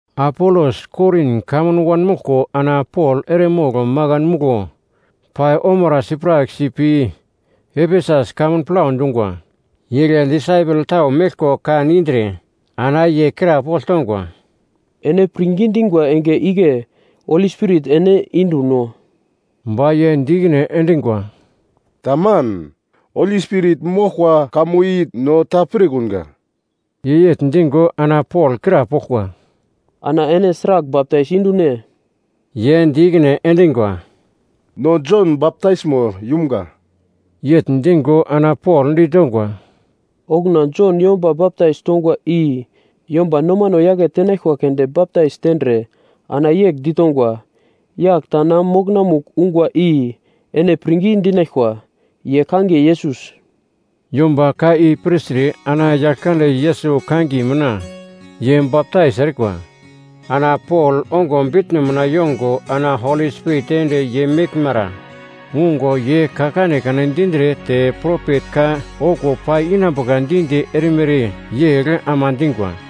Apolos Korin kamun wanmoglko ana Pol eremogl makan muglo pai omara sipraksi pi Efesus kamun plau dungwa. Igle disaipel tau meglko kan indre, ana ye krapogl tongwa, “Ene pirngi dingwa enge igle Holi Spirit ene indu-no?” Ba ye di ikine endingwa, “Taman. Holi Spirit moglkwa kamo i no ta pirkunga.” Ye yegl dingo ana Pol krapoglkwa, “Ana ene sragl baptais indu-ne?” Ye di ikine endingwa, “No Jon baptaismo yumga.” Yegl dingo ana Pol ditongwa, “Okuna Jon yomba baptais tongwa i yomba nomano yake tenaglkwa keunde baptais tendre ana yegl ditongwa, ‘Yagl ta na mokonamugl ungwa i ene pirngi dinaglkwa, ye kangiye Yesus.’” Yomba ka i pirtre ana Yaglkande Yesus kangiye mina ye baptais erikwa. Ana Pol ongo bitno mina yongo ana Holi Spirit ende ye meglmara ungo ye ka kanekane dindre te propet ka okuwo pai inambuka di-di erimere yegl ama dingwa.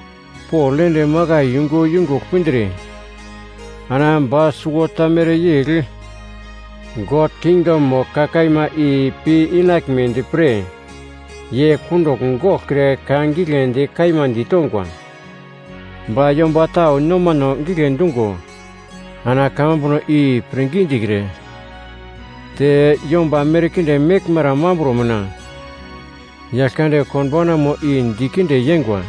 Pol ende makai yungu yungugl pindre ana ba suwota mereyegl God kingdomo ka kaima i piinaglmedi pre ye kundugl goglkre ka giglendi kaima ditongwa. Ba yomba tau nomano gigle dungo ana kamambuno i pirngi dikre, te yomba merkinde meglmara mambro mina, Yaglkande Konbaunamo i dikinde yeingwa.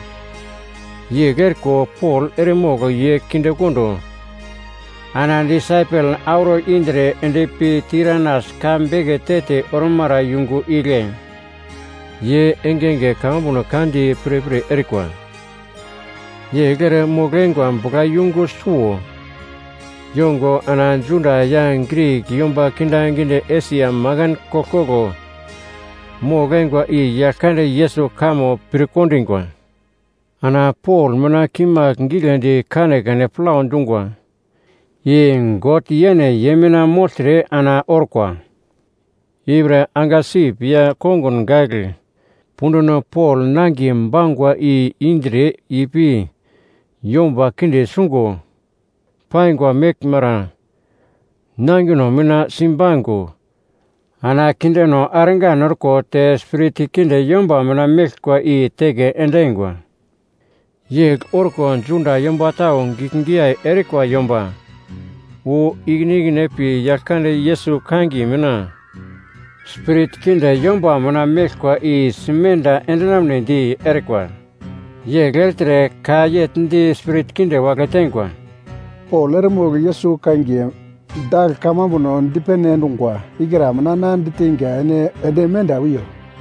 Yegl eriko Pol eremogl ye kindekondo ana disaipel auro indre endpi Tiranas ka beke te-te ormara yungu igle ye engenge kamambuno ka di pirpir erikwa. Yegl ere mogl-eingwa buglayungu suwo yongo ana Juda ya Grik yomba kindaginde Esia makan koglkoglo mogl-eingwa i Yaglkande Yesus kamo pirkondingwa. Ana Pol mina kimagl giglendi kanekane plau dungwa i God yene ye mina mogltre ana orkwa. Ipre angasip ya kongun gagl punduno Pol nangiye pangwa i indre ipi yomba kinde sungo paingwa meglmara nangino mina simbaingo ana kindeno argan orko te spirit kinde yomba mina meglkwa i teke endingwa. Yegl orko Juda yomba tau giglgiyai erikwa yomba wu ikine ikine pi Yaglkande Yesus kangiye mina spirit kinde yomba mina meglkwa i simenda endinamnedi erikwa. Yegl ertre ka yegl di spirit kinde wagle teingwa, “Pol eremogl Yesus kangiye dagl kamambuno dipene endungwa ikra mina na diteinga ene ende menda wiyo.”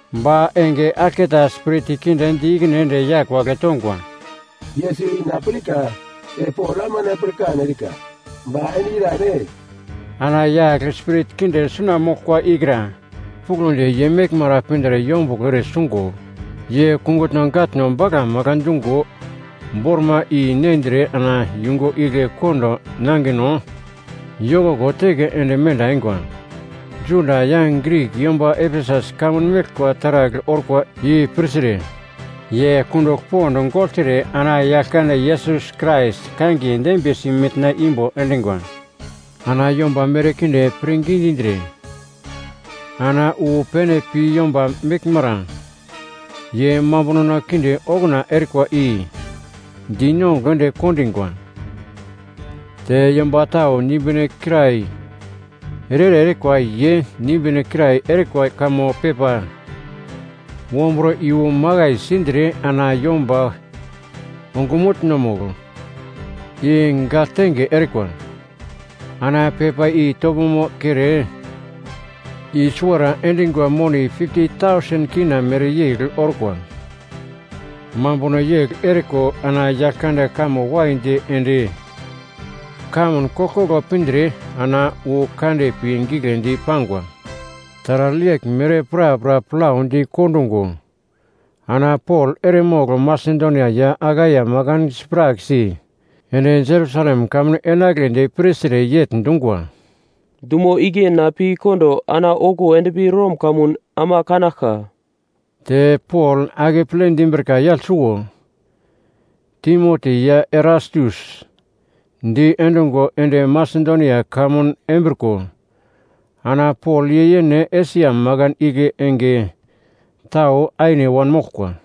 Ba enge aglketa spirit kinde di ikine ende yagl wagle tongwa, “Yesus i na pirka te Pol ama na pirkan erika, ba ene irane?” Ana yagl spirit kinde suna moglkwa ikra puglondi ye meglmara pindre yombuglo ere sungo, ye kungutno gatno bagla magla dungo bormai i-nendre ana yungu igle kondo nangino yokoko teke ende menda eingwa. Juda ya Grik yomba Efesus kamun meglkwa taragl orkwa i pirtre, ye kundugl pond gogltre ana Yaglkande Yesus Krais kangiye dembiyesi mitna imbo endingwa. Ana yomba merkinde pirngi dindre ana wu pene pi yomba meglmara ye mambunono kinde okuna erikwa i dinongugl ende kondingwa. Te yomba tau nimbine kirai ere-ere erikwa ye nimbine kirai erikwa kamo pepa wombro iyu makai sindre ana yomba ongumutno-mugl i gagltenge erikwa. Ana pepa i topomo kere i-suwara endingwa moni K50,000 mereyegl orkwa. Mambuno yegl eriko ana Yaglkande kamo waidi ende kamun koglkoglo pindre ana wu kande pi giglendi pangwa. Taragl yeglmere prapra plaudi kondungo ana Pol eremogl Masedonia ya Akaia makan sipraksi ende Jerusalem kamun enagledi pirtre yegl dungwa, “Dumo igle na pi kondo ana okuwo endpi Rom kamun ama kanaglka.” Te Pol akeple dimbrika yagl suwo, Timoti ya Erastus diendungo ende Masedonia kamun embriko ana Pol ye yene Esia makan igle enge tau aine wanmoglkwa.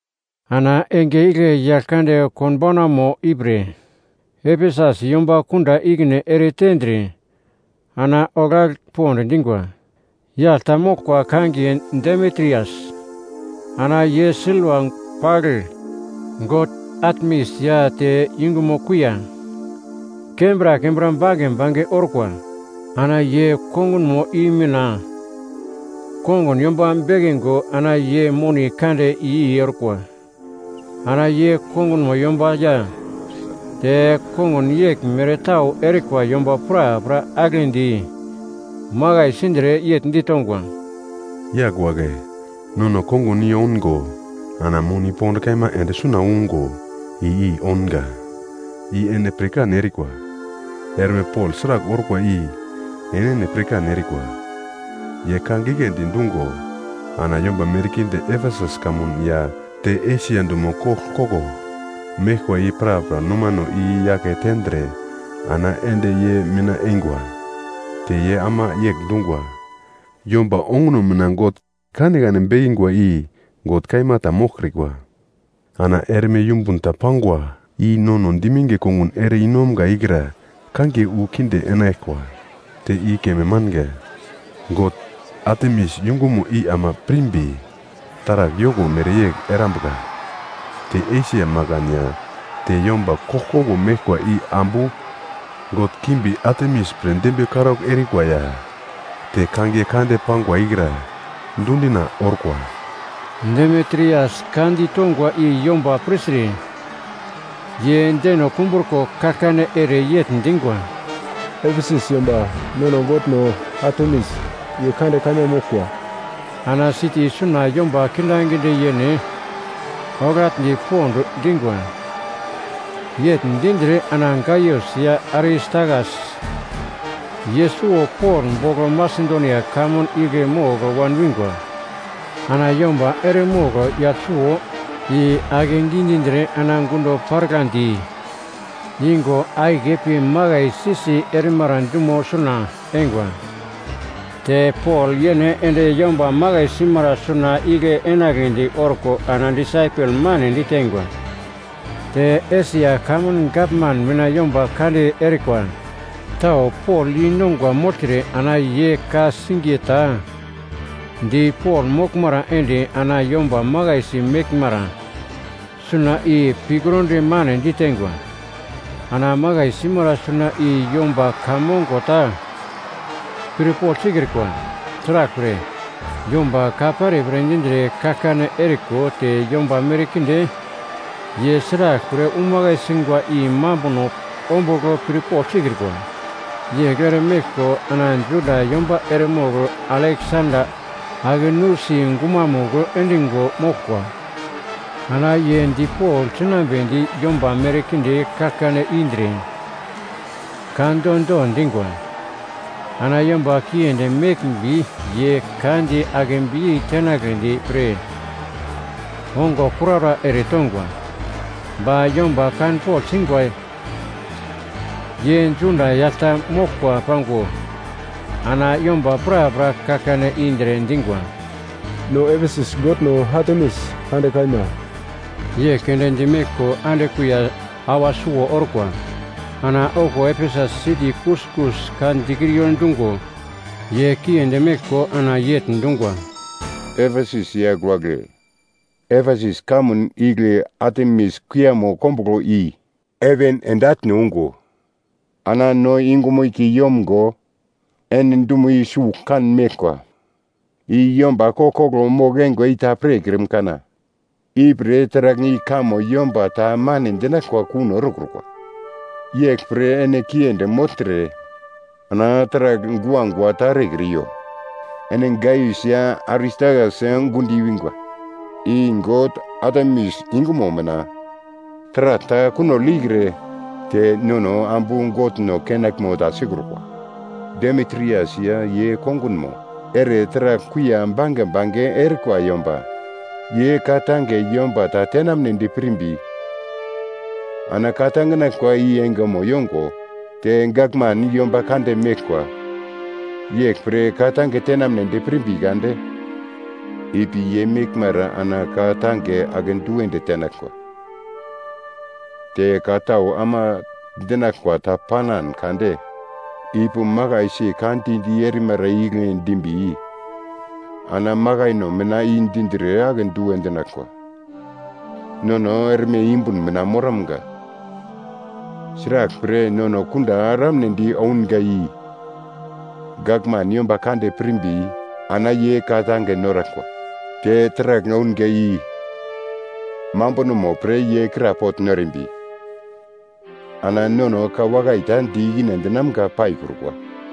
Ana enge, igle Yaglkande Konbaunamo ipre Efesus yomba kunda ikine eretendre ana oglagl pond dingwa. Yagl ta moglkwa kangiye Demitrias. Ana ye silva pagl god Atemis ya te yungumo kuiya kembra kembra bange bange orkwa. Ana ye kongunmo i mina kongun yomba bekingo ana ye moni kande i-i erikwa. Ana ye kongunmo yomba ya te kongun yeglmere tau erikwa yomba prapra aglendi makai sindre, yegl ditongwa, “Yagl wagle! Nono kongun i oungo ana moni pond kaima ende suna ungo i-i ounga, i ene pirkan erikwa. Erme Pol sragl orkwa i enene pirkan erikwa. Ye ka giglendi dungo ana yomba merkinde Efesus kamun ya te Esia dumo koglkoglo meglkwa i prapra nomano i-yake tendre ana ende ye mina eingwa. Te ye ama yegl dungwa, ‘Yomba onguno mina god kanekane bekingwa i god kaima ta moglkrikwa.’ Ana erme yumbun ta pangwa, i nono diminge kongun ere i-nomga ikra kangiye wu kinde enaglkwa, te i keme manga, god kande Atemis yungumo i ama pirmbi taragl yoko mereyegl erambuka. Te Esia makan ya te yomba koglkoglo meglkwa i ambu god Atemis pre dembiye karaugl erikwa ya te kangiye kande pangwa ikra dundina orkwa!” Demitrias ka ditongwa i yomba pirtre, ye deno kumbruko kaglkane ere yegl dingwa, “Efesus yomba nono godno Atemis, ye kande kaima moglkwa!” Ana siti suna yomba kindaginde yene oglagl pond dingwa. Yegl dindre ana Gaius ya Aristakas, ye suwo Pol bogl Masedonia kamun igle mogl wan wingwa. Ana yomba eremogl yagl suwo i akegi dindre ana gundo paraglandi ingo akiye pi makaisi-si erimara dumo suna eingwa. Te Pol yene ende yomba makai simara suna igle enagledi orko ana disaipel mane diteingwa. Te Esia kamun gavman mina yomba kande erikwa tau Pol yeinongwa mogltre ana ye ka-singiye ta di Pol moglmara ende ana yomba makaisi meglmara suna i pikrondi mane ditengwa. Ana makai simara suna i yomba ka mongo ta pirpogl sikrikwa. Sraglpre, yomba ka perepere dindre kaglkane eriko te yomba merkinde ye sraglpre umakai singwa i mambuno ombugl pirpogl sikrikwa. Yegl ere meglko ana Juda yomba eremogl Aleksanda ake nusi gumamugl endingo moglkwa. Ana ye dipogl sinambedi yomba merkinde kaglkane indre ka do-do dingwa. Ana yomba kiendi meglmbi ye ka di akebiyei tenagledi pre ongo kuraura eretongwa. Ba yomba kanpogl singwa, ye Juda yagl ta moglkwa pango ana yomba prapra kaglkane indre dingwa, “No Efesus godno Atemis kande kaima!” Yegl keunde dimeglko ande kuiya awa suwo orkwa. Ana okuwo Efesus siti kuskus ka dikriyo dungo ye kiendi meglko ana yegl dungwa, “Efesus yagl wagle, Efesus kamun igle Atemis kuiyamo kombuglo i heven ende atne ungo ana no yungumo kei yomgo ene dumo i sugl kan meglkwa, i yomba koglkoglo mogl-eingwa i ta pirkrim kana? Ipre, taragl i kamo yomba ta mane dinaglkwa kuno erekrukwa, yeglpre ene kiendi mogltre ana taragl guagua ta erekriyo. Ene Gaius ya Aristakas gundo i-wingwa, i god Atemis yungumo mina taragl ta kunogl ikre te nono ambu godno kenaglmo ta sikrukwa. Demitrias ya ye kongunmo ere taragl kuiya bange bange erikwa yomba ye ka-tange yomba ta tenamnedi pirmbi ana ka-tanginaglkwa i engemo yongo te gavman yomba kande meglkwa. Yeglpre ka-tange tenamnedi pirmbi kade ipi ye meglmara ana ka-tange akedu ende tenaglkwa. Te ka tau ama dinaglkwa ta panan kade ipi makaisi ka di-di erimara igle dimbi ana makaino mina i dindre akedu endinaglkwa. Nono erme yumbun mina moramga, sraglpre, nono kunda eramnedi ounga i gavman yomba kande pirmbi ana ye ka-tange noraglkwa. Te taragl ounga i mambunomo pre ye krapogl norimbi ana nono ka wakai ta di ikine endinamga paikrukwa.”